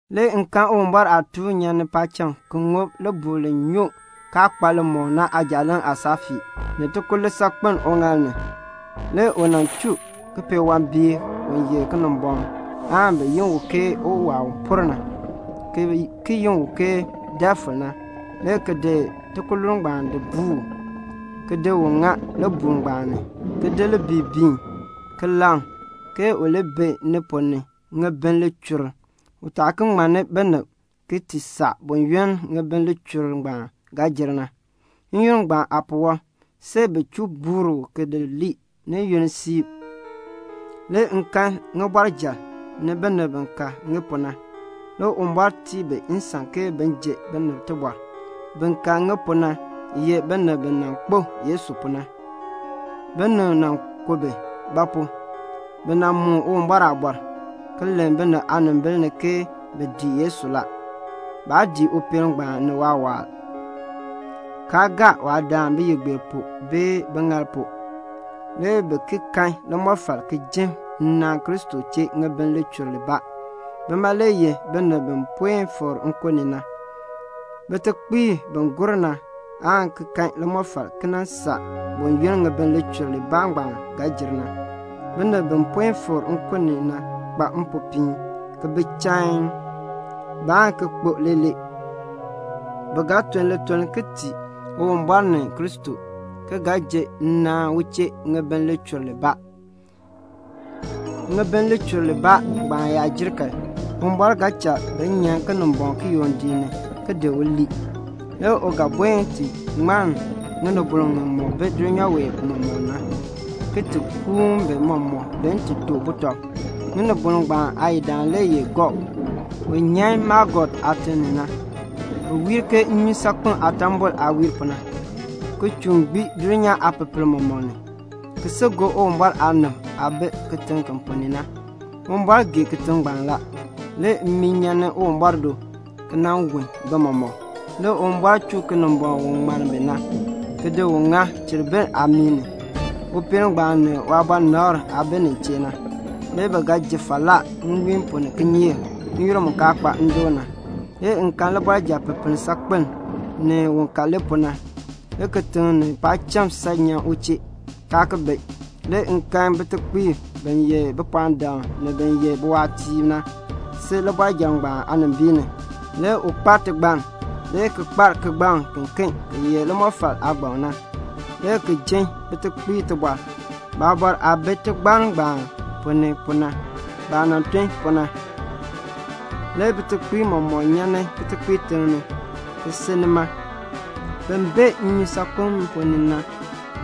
Le m kan Uwumbɔr aatuun nyan ni paacham ki ŋub libuul li nyoo kaa kpa limɔk na aajaaleŋ aasaafii, ni tikululn saakpeln uŋaal ni. Le u chuu kipeewambiik ngbaan u ye Kinimbɔŋ na, bi yi u ke Uwaa u por na, ki ki yi u ke Defil, le ki di tikululn ngbaan ki di buu u, ki di ŋa libuul ngbaan ni ki di biin, ki laŋ a, ke u li bi ni ponn ni ŋibin lichur libaa, u taa ki ŋmanni binib ki ti saa buyoonn ŋibin lichur libaa ngbaan ga jer na. N-yoonn ngbaan aapuwɔb, see bin chuu buur u ki di lii ni yunn siib. Le m kan ŋibɔrjal, ni bin ka ŋi pu na. Le Uwumbɔr tii bi nsan ke bin ji binib tibɔr. Bin ka ŋi pu na ye binib bi nan kpo Yesu pu na. Binib nan ku bi; ba pu? bi moon Uwumbɔr aaliin, ki len binib aanimbil ni ke bi dii Yesu. Baa dii upeel ngbaan ni waawaal, kaa gaa waadaan biyigbeer pu bee biŋaal pu. Le bi ki kan limɔfal ki jin nnaan Kristo chee ŋibin lichur libaa. Bima le ye binib bi puen fikr nkun ni na. Bitekpiib bi gur na aan ki kan limɔfal ki nan saa buyoonn ŋibin lichur libaa ngbaan ga jer na. Binib bi puen fikr nkun ni na kpa mpopiin, ki bi chain. Baan ki kpo leelee. Bi ga tun lituln ki tii Uwumbɔr ni Kristo, ki ga ji nnaan u chee ŋibin lichur libaa. Ŋibin lichur libaa ngbaan yaa jer kan, Uwumbɔr ga cha bi nyan Kinimbɔŋ kiyondiik ni ki lii. Le u ga buen ki ti ŋmann ŋinibol ŋimɔk bi dulnyaa wee mɔmɔk ni na, ki ti kuun bi mɔmɔk bin ti to butɔb. Ŋinibol ngbaan aayidaan le ye Gog, u nyan Magog aatiŋ ni na. Bi wiir ke nnyusaakpem aatambol aah wiir pu na, ki chuun gbii dulnyaa aapepel mɔmɔk, le ki si gob Uwumbɔr aanib aah bi kitiŋ ki ponn ni na. Uwumbɔr gee kitiŋ ngbaan la. Le mmii nyan ni Uwumbɔr do ki wun bi mɔmɔk. Le Uwumbɔr chuu Kinimbɔŋ u ŋmann bi na, le ki di ŋa cheribir aamii ni, upeel ngbaan ni waabɔnabr aah bi nin chee na. Le bi ga ji falaa nwiin pu ni kinyeek, n-yoonn mu kaa kpa ndoon na. Le m kan libɔrjal pipiin saakpiln, ni un ka li pu na. Le kitiŋ ni paacham san nyan u chee, kaa ki bi. Le m kan bitekpiib, bin ye bipɔɔndam ni bin ye biwaatiib na, si libɔrjal ngbaan aanimbiin ni. Le u kpar tigbann, le ki kpar kigbaŋ kiken ki ye limɔfal aagbaŋ na, le ki jin bitekpiib tibɔr, baabɔr aah bi tigbann ngbaan ponn ni pu na, baah nan tun pu na. Le bitekpiib mɔmɔk nyan kitekpiitiŋ ni, ki si nima; bin bee nnyusaakpem ponn ni na,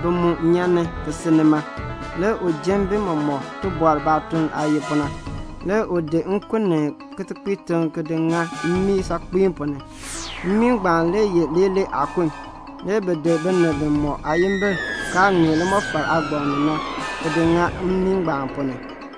bi mu nyan ki si nima. Le u jin bi mɔmɔk tibɔr baatuln aah ye pu na. Le u di nkun ni kitekpiitiŋ ki di ŋa mmii saakpiin ponn ni. Mmii ngbaan le ye leelee aakun. Le bi di binib bimɔk aayimbil kaa ŋmee limɔfal aagbaŋ ni na, ki di bi ki di ŋa mmii ngbaan ponn ni.